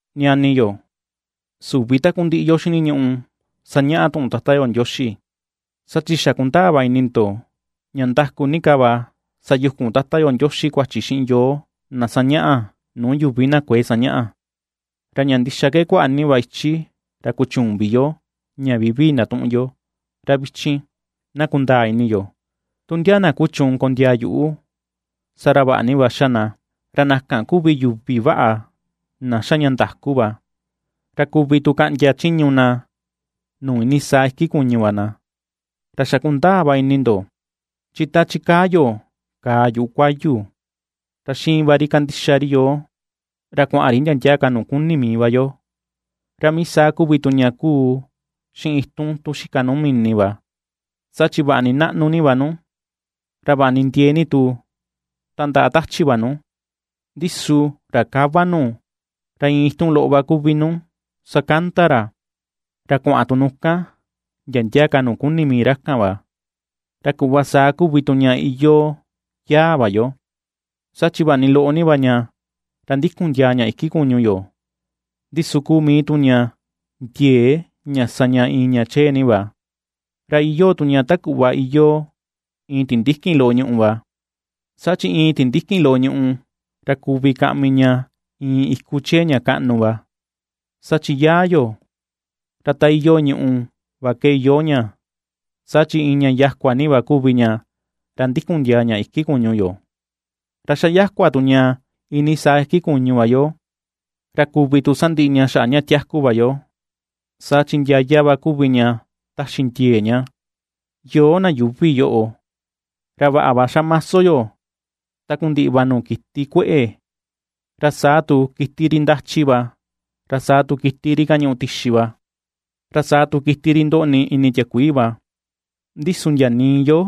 Ñani yo, süvi takundiꞌi yo xiniñuꞌu sañaꞌa tuꞌun Tata yo Ndioxi, saa chi xa kundaa va ini ndo ña ndaku ni ka va sayukun Tata yo Ndioxi kuachi xiꞌin yoo na sañaꞌa nuu yuvi na kuëe sañaꞌa. Ra ña ndixa ke kuaꞌa ni va ichi ra kuchüun vi yo ña vivii ndatuꞌun yo, ra vichin, na kundaa ini yo, tu ndia na kuchuun kondiaa yuꞌu, saa ra vaꞌa ni va xa na, ra na kan kuvi yuvi vaꞌa, na xa ña ndaku va, ra kuvi tu kaꞌndia chiñu na nuu iinii saa iki kuñu va na. Ra xa kundaa va ini ndo, chi ta ^chikaa yo kàà yuꞌu kuayu, ra xiin va ri ña kandixa ri yoo, ra kuaꞌan ri ndia ndia ka nuu kuni mii va yo. Ra mii saa kuvi tu ña kuu xiꞌin itun tun xika nuu mini va; saa chi vaꞌa ni naꞌnu ni va nu, ra vaꞌa ni ndiee ni tu tandaꞌa tachi va nu, ndi su ra kava nu ra iin itun loꞌo va kuvi nu sakanda ra, ra kuaꞌan tu nu kan, ndia ndia ka nuu kuni mii ra kan va. Ra kuꞌva saa kuvi tu ña iyoo yaa va yo; saa chi vaꞌa ni loꞌo ni va ña ra ndikun ndiaa ña iki kuñu yo, ndi su kuu mii tu ña ndiee ña sa ña iin ña chee ni va. Ra iyoo tu ña ta kuꞌva iyoo iin tindikin loꞌo ñùꞌù va, saa chi iin tindikin loꞌo ñùꞌù, ra kuvi kaꞌmi ña iin iku chee ña kaꞌnu va. Saa chi yaa yo, ra ta iyoo ñuꞌu va ke iyoo ña. Saa chi iin ña yakua ni va kuvi ña, ra ndikun ndiaa ña iki kuñu yo, ra ^xa yakua tu ña iinii saa iki kuñu va yo. Ra kuvi tu sandiꞌi ña xaꞌa ña tiaku va yo, saa chi ndiaya va kuvi ña taxi ndiee ña. Yoo na yuuvi yoꞌo, ra vaꞌa va xamaso yo takundiꞌi va nuu kiti kueꞌe, ra saa tu kiti ri ndachi va, ra saa tu kiti ri kañuꞌu tixi va, ra saa tu kiti ri ndoꞌni ini tiakuii va; ndi su ndia nii yo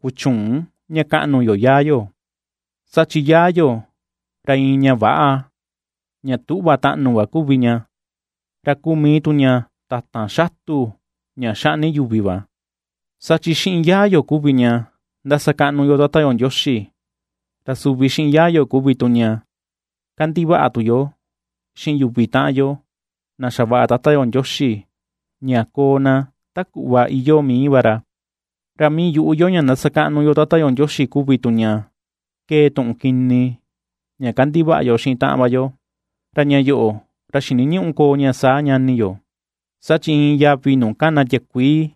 kuchüun ña kaꞌnu yo yaa yo. Saa chi yaa yo, ra iin ña väꞌa, ña tüꞌva taꞌnu va kuvi ña, ra kuu mii tu ña tatan xatu ña xaꞌni yuvi va. Saa chi xiꞌin yaa yo kuvi ña ^ndasakaꞌnu yo Tata yo Ndioxi, ra suvi xiꞌin yaa yo kuvi tu ña kandivaꞌa tu yo xiꞌin yuvi taꞌan yo na xavaꞌa Tata yo Ndioxi ña koo na ta kuꞌva iyoo mii va ra. Ra mii yuꞌu yo ña ndasakaꞌnu yo Tata yo Ndioxi kuvi tu ña kee tuꞌun kini ña kandivaꞌa yo xiꞌin taꞌan va yo, ra ña yoꞌo, ra xiniñüꞌu koo ña saa, ñani yo. Saa chi iin yavi nuu kana tiakuii,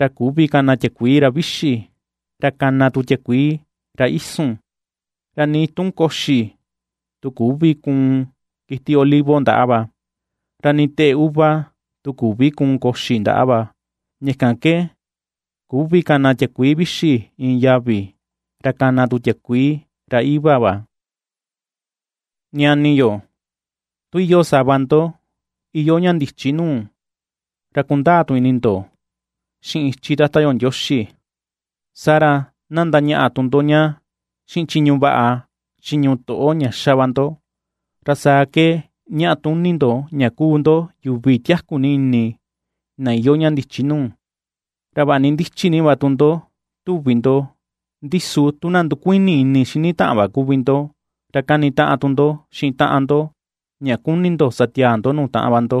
ra küvi kana tiakuii ra vixi, ra kana tu tiakuii ra isun. Ra nii tun koxi tu küvi kuun kiti olivo ndaꞌa va, ra nii teꞌe uva tu küvi kuun koxi ndaꞌa va, ña kan ke küvi kana tiakuii vixi iin yavi, ra kana tu tiakuii ra iꞌva va. Ñani yo, tu iyoo sava ndo iyoo ña ndichi nuu, ra kundaa tu ini ndo xiꞌin ichi Tata yo Ndioxi, saa ra na ndañaꞌa tu ndo ña xiꞌin chiñu vaꞌa, chiñu toꞌo ña xa va ndo, ra saa ke ñaꞌa tuni ndo ña kuu ndo yuvi na tiaku ni ini na iyoo ña ndichi nuu. Ra vaꞌa ni ndichi ni va tu ndo tuvi ndo, ndi su tu na ndukuini ini xini taꞌan va kuvi ndo, ra kanitaꞌan tu ndo xiꞌin taꞌan ndo ña kuni ndo sa tiaa ndo nuu taꞌan va ndo,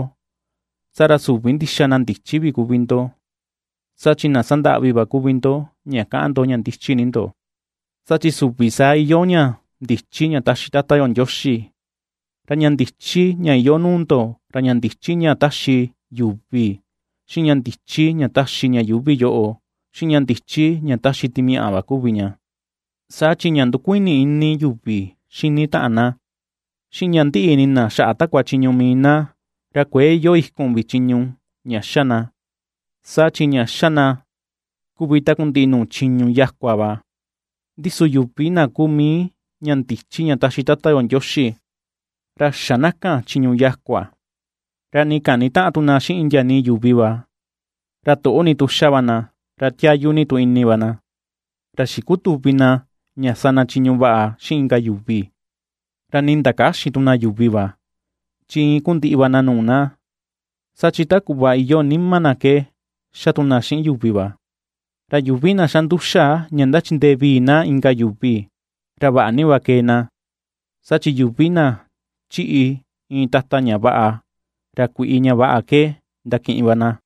saa ra süvi ndixa na ndichi vi kuvi ndo, saa chi na sandaꞌvi va kuvi ndo ña kaꞌan ndo ña ndichi ni ndo. Saa chi süvi saa iyoo ña ndichi ña taxi Tata yo Ndioxi, ra ña ndichi ña iyoo nuu ndo ra ña ndichi ña taxi yuvi, xiꞌin ña ndichi ña taxi ña yuuvi yoꞌo, xiꞌin ña ndichi ña taxi timiaꞌa va kuvi ña. Saa chi ña ndukuini ini yuvi xini taꞌan na, xiꞌin ña ndiꞌi ini na xaꞌa takua chiñu mii na, ra kuëe iyoo ikun vi chiñu ña xa na, saa chi ña xa na kuvi takundiꞌi nuu chiñu yakua va. Ndi su yuvi na kuu mii ña ndichi ña taxi Tata yo Ndioxi, ra xä na kan chiñu yakua, ra nii kanitäꞌan tu na xiꞌin ndia nii yuvi va; ra toꞌo ni tu xa va na, ra tiayu ni tu ini va na, ra xikutüvi na ña sa na chiñu vaꞌa xiꞌin inka yuvi, ra nii ndakäxin tu na yuvi va, chi iin ku ndiꞌi va na nuu na, saa chi ta kuꞌva iyoo nima na ke xa tu na xiꞌin yuvi va. Ra yuvi na xa nduxa ña ndachindee vii na inka yuvi, ra vaꞌa ni va kee na, saa chi yuvi na ^chiꞌi iin tata ña vaꞌa, ra kuiꞌi ña vaꞌa ke ^ndakiꞌin va na.